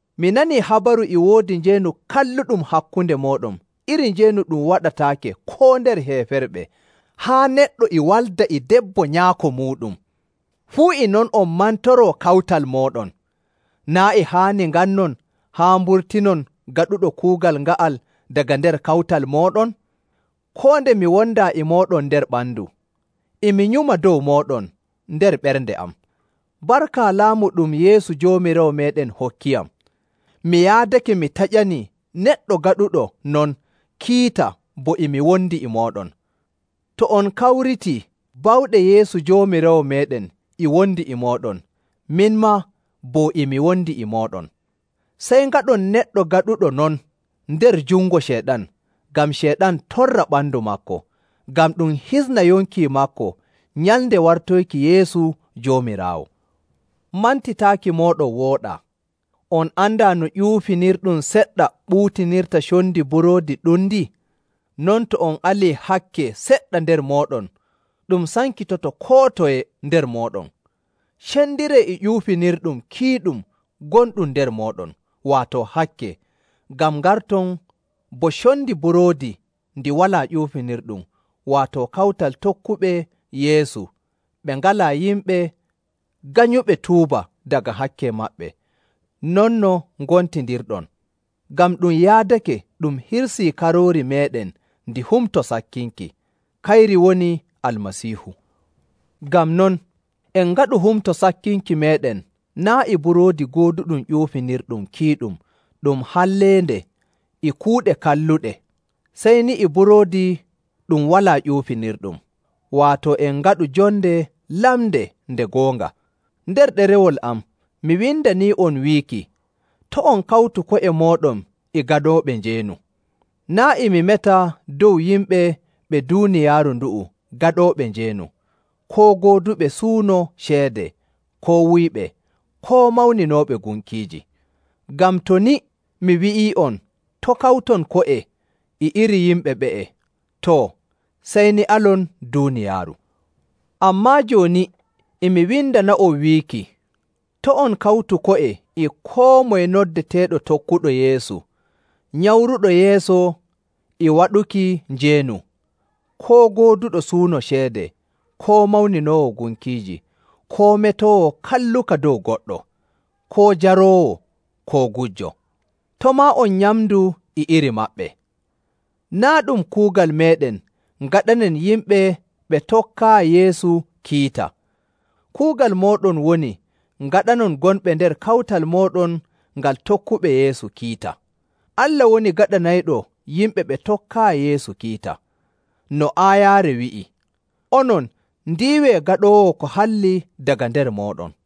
Mi nanii habaru e woodi njeenu kalluɗum hakkunde mooɗon iri njeenu ɗum waɗataake koo nder heeferɓe, haa neɗɗo e walda e debbo nyaako muuɗum! Fuu e non on mantoroo kawtal mooɗon! Naa' e haani ngannon haa mburtinon gaɗuɗo kuugal nga'al daga nder kawtal mooɗon? Koo nde mi wondaa e mooɗon nder ɓandu, e mi nyuma dow mooɗon nder ɓernde am. Barka laamu ɗum Yeesu Joomiraawo meeɗen hokkiyam, mi yaadake mi taƴanii neɗɗo gaɗuɗo non kiita bo e mi wondi e mooɗon. To on kawritii, bawɗe Yeesu Joomiraawo meeɗen e wondi e mooɗon, min maa, bo e mi wondi e mooɗon. Sey ngaɗon neɗɗo gaɗuɗo non nder jungo Ceyɗan, ngam Ceyɗan torra ɓandu maako, ngam ɗum hisna yonki maako nyalnde wartoyki Yeesu Joomiraawo. Mantitaaki mooɗon wooɗaa. On andaa no ƴuufinirɗum seɗɗa ɓuutinirta condi buroodi ɗundi? Non to on alii hakke seɗɗa nder mooɗon, ɗum sankitoto koo toye nder mooɗon. Cendiree e ƴuufinirɗum kiiɗum gonɗum nder mooɗon, waato hakke, ngam ngarton bo condi buroodi ndi walaa ƴuufinirɗum, waato kawtal tokkuɓe Yeesu ɓe ngalaa yimɓe nganyuɓe tuuba daga hakke maɓɓe, non no ngontindirɗon. Ngam ɗum yaadake ɗum hirsii karoori meeɗen ndi Humto Sakkinki. Kayri woni Almasiihu. Ngam non, en ngaɗu Humto Sakkinki meeɗen naa' e buroodi gooduɗum ƴuufinirɗum kiiɗum ɗum halleende e kuuɗe kalluɗe, sey ni e buroodi ɗum walaa ƴuufinirɗum, waato en ngaɗu jonde lamnde nde goonga. Nder ɗerewol am mi windanii'on wiiki, to' on kawtu ko'e mooɗon e gaɗooɓe njeenu. Naa' e mi meta dow yimɓe ɓe duuniyaaru ndu'u gaɗooɓe njeenu, koo gooduɓe suuno ceede, koo wuyɓe, koo mawninooɓe gunkiiji. Ngam to ni mi wi'ii'on, to' kawton ko'e e iri yimɓe ɓe'e, too, sey ni alon duuniyaaru. Ammaa jooni e mi windana'on wiiki, to' on kawtu ko'e e koo moye noddeteeɗo tokkuɗo Yeesu, nyamruɗo yeeso e waɗuki njeenu, koo gooduɗo suuno ceede, koo mawninoowo gunkiiji, koo metoowo kalluka dow goɗɗo, koo jaroowo, koo gujjo. To' maa on nyamdu e iri maɓɓe. Naa' ɗum kuugal meeɗen ngaɗanen yimɓe ɓe tokkaayi Yeesu kiita. Kuugal mooɗon woni ngaɗanon gonɓe nder kawtal mooɗon ngal tokkuɓe Yeesu kiita. Allah woni gaɗanayɗo yimɓe ɓe tokkaayi Yeesu kiita. No aayaare wi'i, “Onon, ndiiwee gaɗoowo ko halli daga nder mooɗon.”